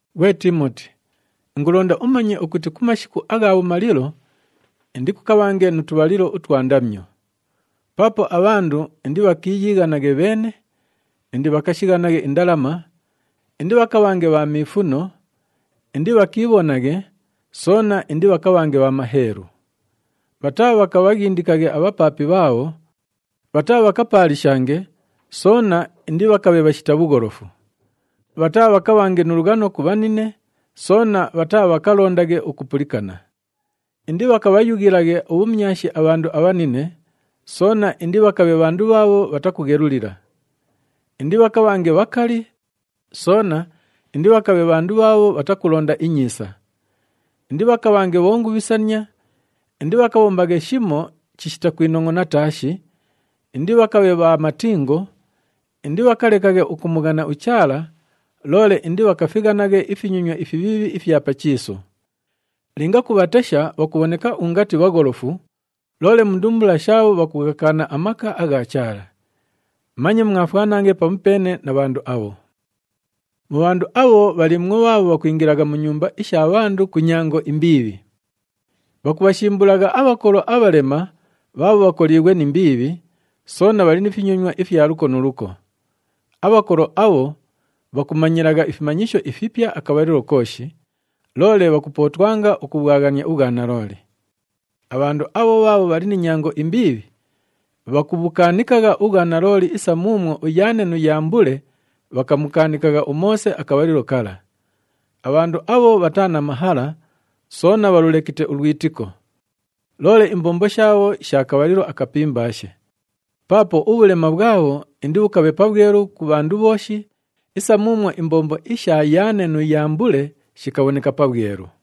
Ghwe Tiimoti, ingulonda umanye ukuti ku mashiku agha bhumalilo indikukabhange nu tubhalilo utwa ndamyo. Paapo abhandu indibhakiiyighanaghe bheene, indibhakashighanaghe indalama, indibhakabhange bha miifuno, indibhakiibhonaghe, soona indibhakabhange bha maheelu. Bhataabhakabhaghindikaghe abhapaapi bhaabho, bhataabhakapaalishange, soona indibhakabhe bhashita bhugholofu. Bhataabhakabhange nu lughano ku bhanine, soona bhataabhakalondaghe ukupulikana. Indibhakabhayughilaghe ubhumyashi abhandu abhanine, soona indibhakabhe bhandu bhaabho bhatakughelulila. Indibhakabhange bhakali, soona indibhakabhe bhandu bhaabho bhatakulonda inyiisa. Indibhakabhange bhongubhisania, indibhakabhombaghe shimo chishita kwinongʼona taashi, indibhakabhe bha matingo, indibhakalekaghe ukumughana uChaala, loole indibhakafighanaghe ifinyonywa ifibhiibhi ifya pa chiisu. Linga kubhatesha bhakubhoneka ungati bhagholofu, loole mu ndumbula shaabho bhakughakaana amaka agha Chaala. Manye mwafwanaghe pamupeene na bhandu abho. Mu bhandu abho, bhaliimwo bhaabho bhakwingilagha mu nyumba isha bhandu ku nyango imbiibhi. Bhakubhashimbulagha abhakolo abhalema bhaabho bhakoliighwe ni mbiibhi, soona bhali ni finyonywa ifya luko nu luko. Abhakolo abho bhakumanyilagha ifimanyisho ifipya akabhalilo kooshi, loole bhakupootwanga ukubhwaghania ubhwanalooli. Abhandu abho bhaabho bhali ni nyango imbiibhi, bhakubhukaanikagha ubhwanalooli isa muumwo uYaane nu Yambule bhakamukaanikagha uMoose akabhalilo kala. Abhandu abho bhataa na mahala, soona bhalulekite ulwitiko. Loole imbombo shaabho sha kabhalilo akapimbaashe, paapo ubhulema bhwabho indibhukabhe pabhwelu ku bhandu bhooshi isa muumwo imbombo isha Yaane nu Yambule shikabhoneka pabhwelu.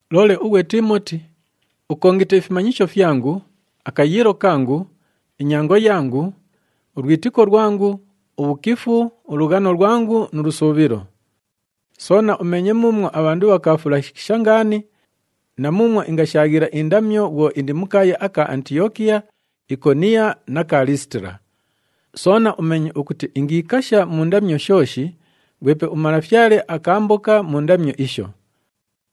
Loole ughwe Tiimoti, ukongite ifimanyisho fyangu, akayiilo kangu, inyango yangu, ulwitiko lwangu, ubhukifu, ulughano lwangu nu lusuubhilo. Soona umeenye muumwo abhandu bhakaafulashikisha ngaani na muumwo ingashaaghila indamyo bhwo indi mu kaaya aka Antiyokiya, Ikoniyo na ka Liisitila. Soona umeenye ukuti ingiikasha mu ndamyo shooshi, ghwepe uMalafyale akaamboka mu ndamyo isho.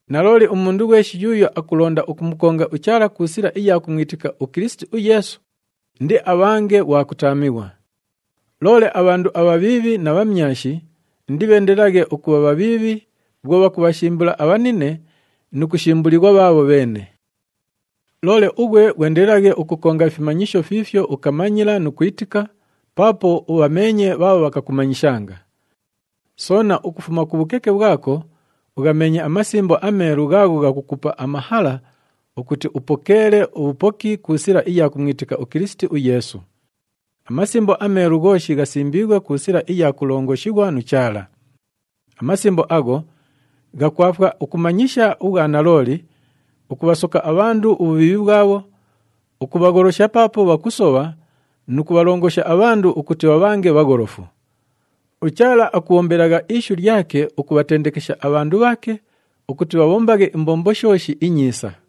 Nalooli, umundu ghweshi yuuyo akulonda ukumukonga uChaala ku sila iya kumwitika uKilisiti uYeesu, indiabhange ghwa kutaamighwa. Loole abhandu abhabhiibhi na bhamyashi indibheendelelaghe ukubha bhabhiibhi bhwo bhakubhashimbula abhanine nu kushimbulighwa bhaabho bheene. Loole ughwe ghwendelelaghe ukukonga ifimanyisho fiifyo ukamanyila nu kwitika, paapo ubhameenye bhaabho bhakakumanyishanga. Soona ukufuma ku bhukeke bhwako ughameenye aMasimbo aMeelu ghaagho ghakukupa amahala ukuti upokeele ubhupoki ku sila iya kumwitika uKilisiti uYeesu. AMasimbo aMeelu ghooshi ghasimbiighwe ku sila iya kulongoshighwa nu Chaala. AMasimbo agho ghakwafwa ukumanyisha ubhwanalooli, ukubhasoka abhandu ubhubhiibhi bhwabho, ukubhagholosha paapo bhakusobha nu kubhalongosha abhandu ukuti bhabhange bhagholofu. UChaala akubhombelagha ishu lyake ukubhatendekesha abhandu bhaake ukuti bhabhombaghe imbombo shooshi inyiisa.